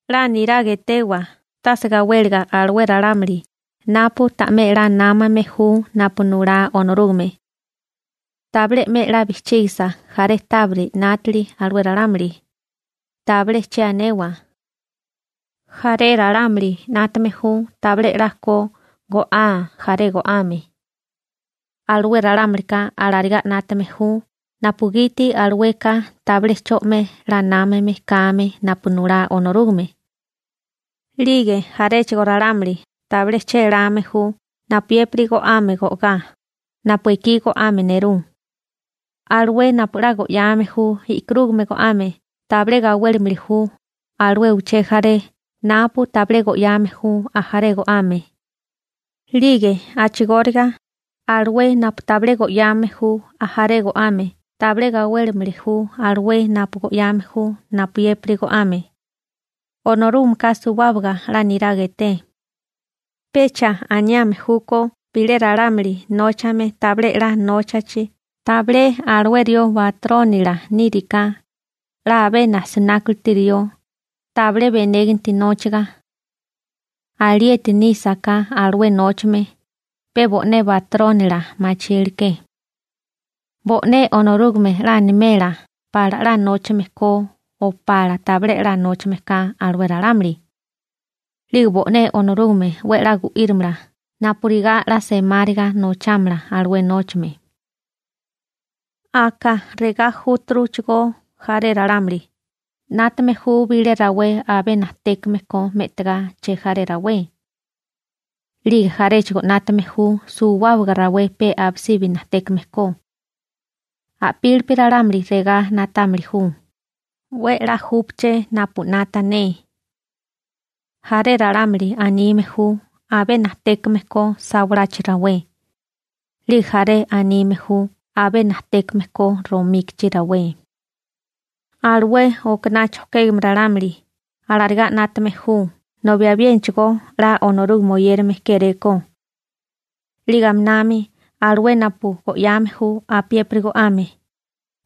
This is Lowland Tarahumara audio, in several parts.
'La niraga etewa tase gawéliga alué ralámuli napu ta'mé 'la námame ju napu nulá Onorúgame. Tabilé 'me 'la bijchígasa jaré tábiri 'nátili alué ralámuli, tabilé che anewa. Jaré ralámuli 'nátame ju tabilé 'la ko go'aa ajaré go'ame. Alué ralámulika alarigá 'nátame ju napugiti alueka tabilé 'cho 'me 'la námame kame napu nulá Onorúgame. 'Lige jaréchigo ralámuli tabilé chéláme ju napuyépiri go'ame go'gá, napu ekí go'ame nerú. Alué napu 'la go'yame ju e'karúgamea go'ame tabilé gawélimili ju alué uché jaré napu tabilé go'yame ju ajaré go'ame. 'Lige a'chigóriga, alué napu tabilé go'yame ju ajaré go'ame tabilé gawélimili ju alué napu go'yame ju napuyépiri go'ame. Onorúgameka suwábaga 'la niraga eté. Pecha aniame júkó bilé ralámuli nóchame tabilé 'la nóchachi tabilé alué rió batrónila níriká: «'La abé najsinákuliti rió, tabilé benéganti nóchaga.» Alieti nísaká alué nóchame, pe bo'né batrónila machíleké. Bo'né Onorúgame 'la animela pala 'la nóchame ko o pala tabilé 'la nóchame ka alué ralámuli. 'Lige bo'né Onorúgame 'we a'lá gu'írimala napurigá 'la semáriga nochámala alué nóchame. Aka regá júturuchigó jaré ralámuli, 'nátame ju bilé rawé abé najtékame ko me'tigá chejaré rawé. 'Lige jaréchigo 'nátame ju suwábaga rawé pe abisibi najtékame ko. A'pílipi ralámuli regá na'támili ju: «'We 'la júpaché napu 'nata ne.» Jaré ralámuli anime ju abé najtékame ko sawalachi rawé, 'lige jaré anime ju abé najtékame ko romíkichi rawé. Alué okaná chojkégame ralámuli alarigá 'nátame ju nobi abiénachigo 'la Onorúgame oyérame kéréko. 'Lige aminami alué napu go'yame ju apiépiri go'ame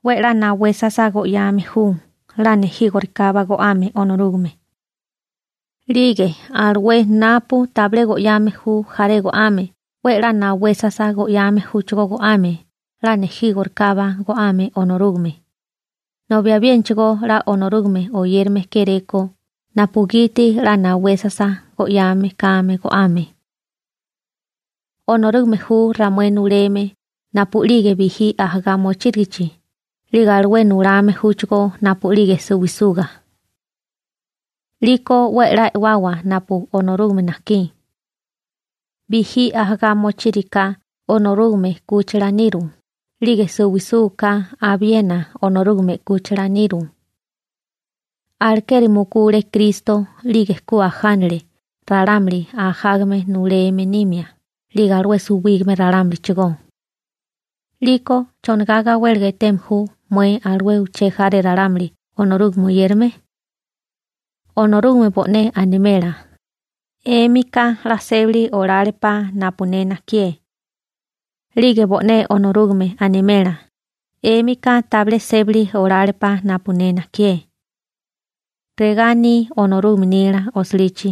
'we 'la nawesasa go'yame ju 'la nejígorikábá go'ame Onorúgame. 'Lige alué napu tabilé go'yame ju jaré go'ame 'we 'la nawesasa go'yame júchigó go'ame 'la nejígorikábá go'ame Onorúgame, nobi abiénachigo 'la Onorúgame oyérame kéréko napugiti 'la nawesasa go'yame kame go'ame. Onorúgame ju ramué nuleme napu'lige bijí ajagá mochírigichi 'lige alué nulame júchigó napu'lige suwisuga. 'Liko 'we a'lá e'wawa napu Onorúgame najkí. Bijí ajagá mochíriká Onorúgame 'kúchila niru 'lige suwisúgaká abiena Onorúgame 'kúchila niru. Alekeri mukule Kristo 'lige ku ajánale ralámuli ajágame nuleme nimia 'lige alué suwígame ralámulichigó. 'Liko ¿chonigá gawéliga eteme ju mué alué uché jaré ralámuli Onorúgame oyérame? Onorúgame bo'né animela: «'Émika 'la sébali olálepá napu ne najkié.» 'Lige bo'né Onorúgame animela: «'Émika tabilé sébali olálepá napu ne najkié.» Regá aní Onorúgame nila osilichi: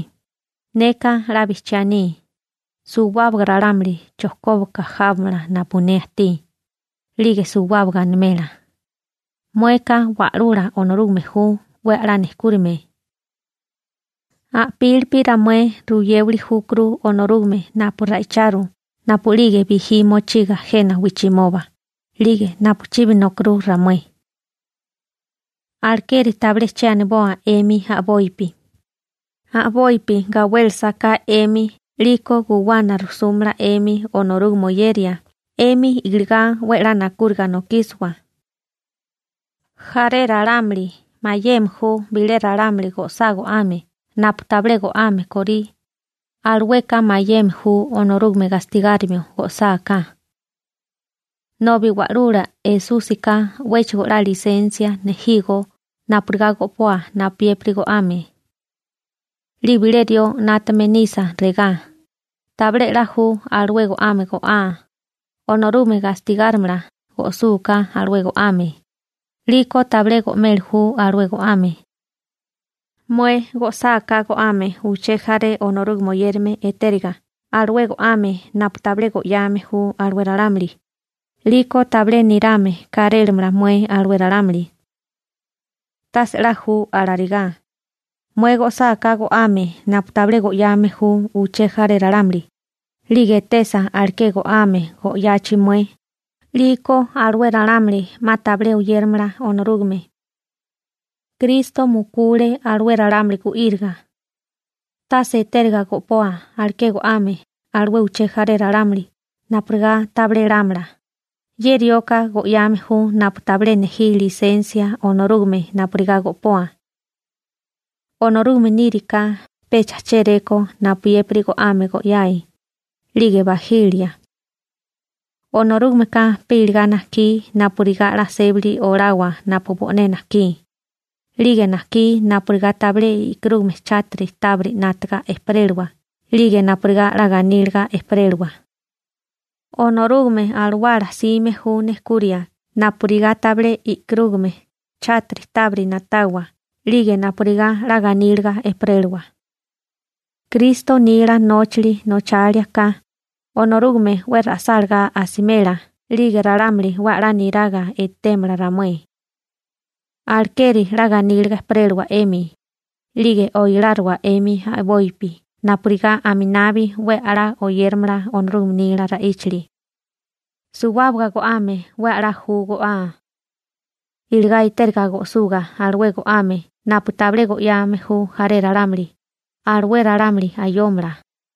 Neka 'la bijchiá aní: «Suwábaga ralámuli chojkóbaga jábamala napu ne ajtí», 'lige suwábaga animela: «Mueka Wa'lula Onorúgame ju, 'we a'lá nejkúrime.» A'pílipi ramué ruyéwili júkuru Onorúgame napu ra'icharu napu'lige bijí mochiga jena wijchimoba 'lige napu chibi nokirú ramué. Alekeri tabilé che aniboa 'emi a'bopi, a'bopi gawélesa ka 'emi 'liko guwana rujsúmala 'emi Onorúgame oyeria 'emi iligá 'we 'la nakúriga nokísiwa. Jaré ralámuli mayeme ju bilé ralámuli go'sá go'ame napu tabilé go'ame kórí, alueka mayeme ju Onorúgame gastigárimio go'sáká. Nobi Wa'lula Esúsika 'wéchigo 'la lisensia nejígó napurigá go'poa napuyépiri go'ame. 'Lige bilé rió 'nátame nisa regá: «Tabilé 'la ju alué go'ame go'aa, Onorúgame gastigárimala go'súká alué go'ame», 'liko tabilé go'meli ju alué go'ame. Mué go'sáká go'ame uché jaré Onorúgame oyérame etériga alué go'ame napu tabilé go'yame ju alué ralámuli, 'liko tabilé nirame kárélamala mué alué ralámuli. Tase 'la ju alarigá, mué go'sáká go'ame napu tabilé go'yame ju uché jaré ralámuli, 'lige etesa aleké go'ame go'yachi mué, 'liko alué ralámuli 'ma tabilé oyéramala Onorúgame. Kristo mukule alué ralámuli gu'íriga. Tase etériga go'poa aleké go'ame alué uché jaré ralámuli napurigá tabilé lámala: «Ye rioka go'yame ju napu tabilé nejí lisensia Onorúgame napurigá go'poa.» Onorúgame níriká pecha chéréko napuyépiri go'ame go'yae, 'lige bajilia. Onorúgameka pe iligá najkí napurigá 'la sébali olawa napu bo'né najkí, 'lige najkí napurigá tabilé i'kurúgame chátiri tábiri 'nátaga ejperélawa 'lige napurigá 'la ganíliga ejperélawa. Onorúgame Alawala 'sime ju nejkuria napurigá tabilé i'kurúgame chátiri tábiri na'tawa 'lige napurigá 'la ganíliga ejperélawa. Kristo nila nóchali nochalia ka, Onorúgame 'we ra'sálagá asimela, 'lige ralámuli 'we a'lá niraga etémala ramué. Alekeri 'la ganíliga ejperélawa 'emi, 'lige oiláriwa 'emi a'bopi napurigá aminabi 'we a'lá oyéramala Onorúgame nila ra'íchali. Suwábaga go'ame 'we a'lá ju go'á. Iligá etériga go'suga alué go'ame napu tabilé go'yame ju jaré ralámuli, alué ralámuli ayómala,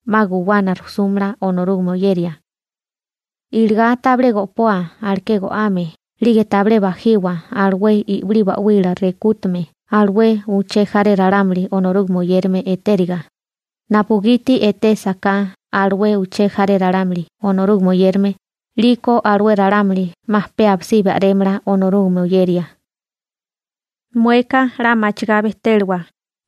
'ma guwana rujsúmala Onorúgame oyeria. Iligá tabilé go'poa aleké go'ame 'lige tabilé bajiwa alué i'wilí ba'wila rekútume alué uché jaré ralámuli Onorúgame oyérame etériga, napugiti etésaká alué uché jaré ralámuli Onorúgame oyérame 'liko alué ralámuli 'ma pe abisí a'rémala Onorúgame oyeria. Mueka 'la machigá bejtélawa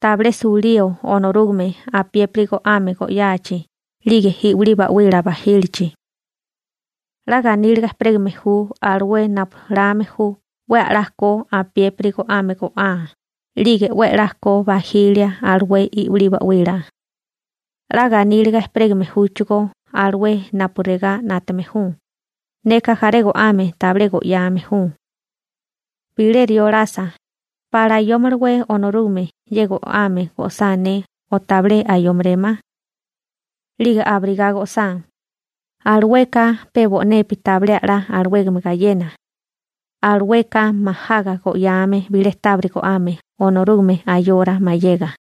tabilé sulío Onorúgame apiépiri go'ame go'yachi 'lige i'wilí ba'wila bajílichi. 'La ganíliga ejperégame ju alué napu lame ju 'we a'lá ko apiépiri go'ame go'á 'lige 'we 'la ko bajilia alué i'wilí ba'wila. 'La ganíliga ejperégame júchigó alué napu regá 'nátame ju: «Neka jaré go'ame tabilé go'yame ju.» Bilé rió lasa: «¿Pala ayómalawé Onorúgame ye go'ame go'sá ne o tabilé ayómerémá?» 'lige abirigá go'sá, alueka pe bo'nepi tabilé a'lá alawégame gayena, alueka majaga go'yáame bilé tábiri go'ame Onorúgame ayora mayega.